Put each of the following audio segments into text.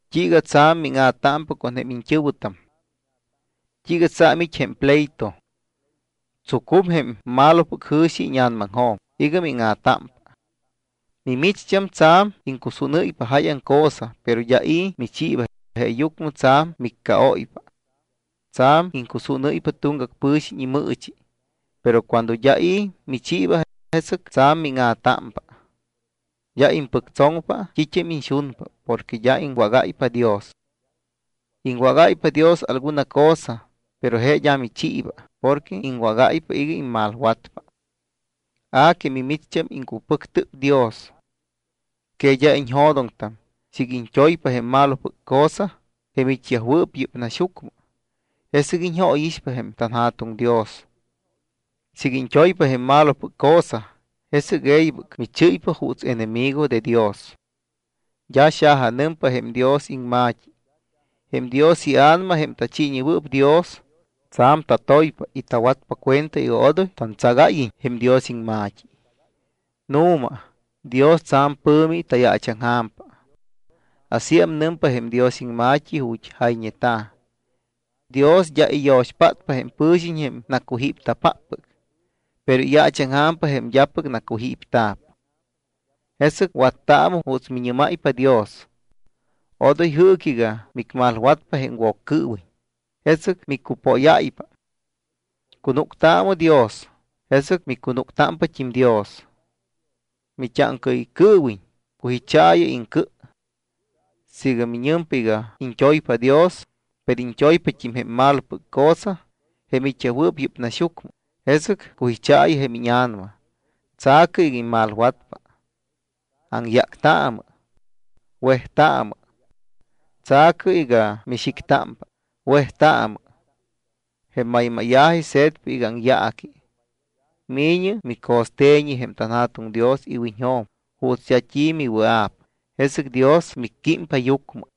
¿T́iiga tsa̱m míŋa̱támpa con jém iñt́ɨ̱wɨtam? ¿T́iiga tsa̱m it́ jém pleito? Tsucum jém malopɨc jɨ̱xi íña̱namaŋjo̱m iga míŋa̱támpa. Mimicht́am tsa̱m iŋcusúnɨ́ypa jáyaŋ cosa, pero d́a i̱ michiiba, jeeyucmɨ tsa̱m miccaóypa. Tsa̱m iŋcusúnɨ́ypa tuŋgac pɨ̱xiñ imɨɨchi, pero cuando d́a i̱ michiiba, jesɨc tsa̱m míŋa̱támpa. D́a impɨctsoŋpa t́it́am iñxunpa porque d́a iŋwágáypa Dios. Iŋwágáypa Dios alguna cosa, pero je d́a michiiba porque iŋwágáypa iga immalwatpa. A que mimicht́am, iŋcupɨctɨp Dios. ¿Que d́a iñjo̱doŋtam siiga iñt́oypa jém malopɨc cosa jém it́yajwɨɨp yɨ́p naxyucmɨ, jesɨc iñjóyixpa jém tanJa̱tuŋ Dios? Siiga iñt́oypa jém malopɨc cosa, jesɨc e̱ybɨc michɨ́ypa juuts enemigo de Dios. D́a xajanɨmpa jém Dios iŋma̱t́i: “Jém Dios iA̱nama, jém tachiiñewɨɨp Dios, tsa̱m tatoypa y tawatpa cuenta iga odoy tantsagáyiñ jém Dios iŋma̱t́i.” Nu̱ma, Dios tsa̱m pɨ̱mi tayaachaŋja̱mpa. Asíam nɨmpa jém Dios iŋma̱t́i ju̱t́ jayñeta̱: “Dios d́a iyo̱xpátpa jém pɨ̱xiñ jém nacujípta̱páppɨc. Pero iyaachaŋja̱mpa jém d́apɨc nacujípta̱p.” Jesɨc wattaamɨ juuts miñɨ́máypa Dios. Odoy jɨɨcɨ iga micmalwatpa jém Woccɨɨwiñ, jesɨc micupóyáypa. Cunúctaamɨ Dios, jesɨc micunúcpat́im Dios. Mit́áŋcaɨycɨɨwiñ, cujichaayɨ iŋcɨ. Siiga miñɨmpa iga iñt́oypa Dios, pero iñt́oypat́im jém malopɨc cosa, jém it́yajwɨɨp yɨ́p naxyucmɨ, jesɨc cujichaayɨ jém íña̱nama, tsa̱cɨ iga immalwatpa. Aŋyáctaamɨ. Wejtaamɨ. Tsa̱cɨ iga mixictámpa, wejtaamɨ. Jém maymáya̱ji se̱tpa iga aŋyaaqui. Mi̱ñɨ mico̱ste̱ñi jém tanJa̱tuŋ Dios iwiñjo̱m juuts d́a t́i miwɨa̱p, jesɨc Dios micquímpa yucmɨ.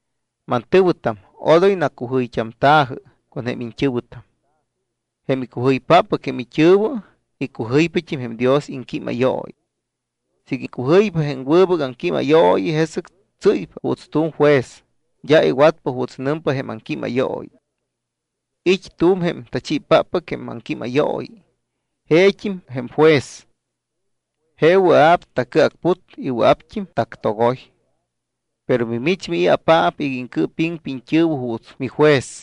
Mantɨ̱wɨtam, odoy nacujɨyt́amta̱jɨ con jém iñt́ɨ̱wɨtam. Jém icujɨypáppɨc jém it́ɨ̱wɨ, icujɨypat́im jém Dios iŋquímayooyi. Siiga icujɨypa jém wɨbɨc aŋquímayooyi, jesɨc tsɨ́ypa juuts tu̱m juez, d́a iwatpa juuts nɨmpa jém aŋquímayooyi. It́ tu̱m jém Tachiipáppɨc jém Aŋquímayooyi, jeet́im jém Juez. Je wɨa̱p tacɨacput. Wɨa̱pt́im tactogoy. ¿Pero mimich mii̱apaap iga iŋcɨɨpiŋpa iñt́ɨ̱wɨ juuts mijuez?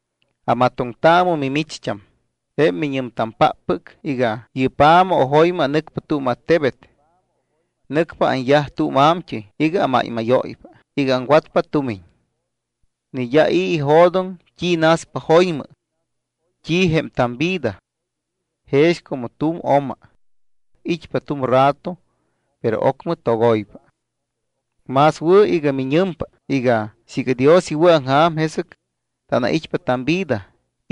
Amatoŋtaamɨ mimicht́am, jém miñɨmpáppɨc iga: “Yɨ́p ja̱ma o jo̱ymɨ anɨcpa tu̱m attebet. Nɨcpa anyaj tu̱m a̱mt́ɨy iga amáymáyóypa iga aŋwatpa tumiñ.” Ni d́a i̱ ijo̱doŋ t́i naspa jo̱ymɨ. ¿T́i jém tamvida? Jex como tu̱m oma. It́pa tu̱m rato, pero ocmɨ togoypa. Más wɨ̱ iga miñɨmpa iga: “Siiga Dios iwɨ̱aŋja̱m, jesɨc tanait́pa tamvida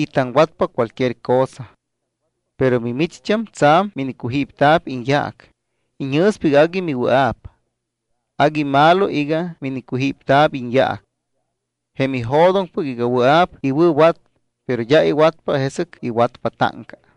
y taŋwatpa cualquier cosa.” Pero mimicht́am tsa̱m minicujípta̱p iñyaac, iñjɨ̱spa iga agui miwɨa̱p. Agui malo iga minicujípta̱p iñyaac. Jém ijo̱doŋpɨc iga wɨa̱p iwɨ̱wat, pero d́a iwatpa, jesɨc iwatpa táŋca.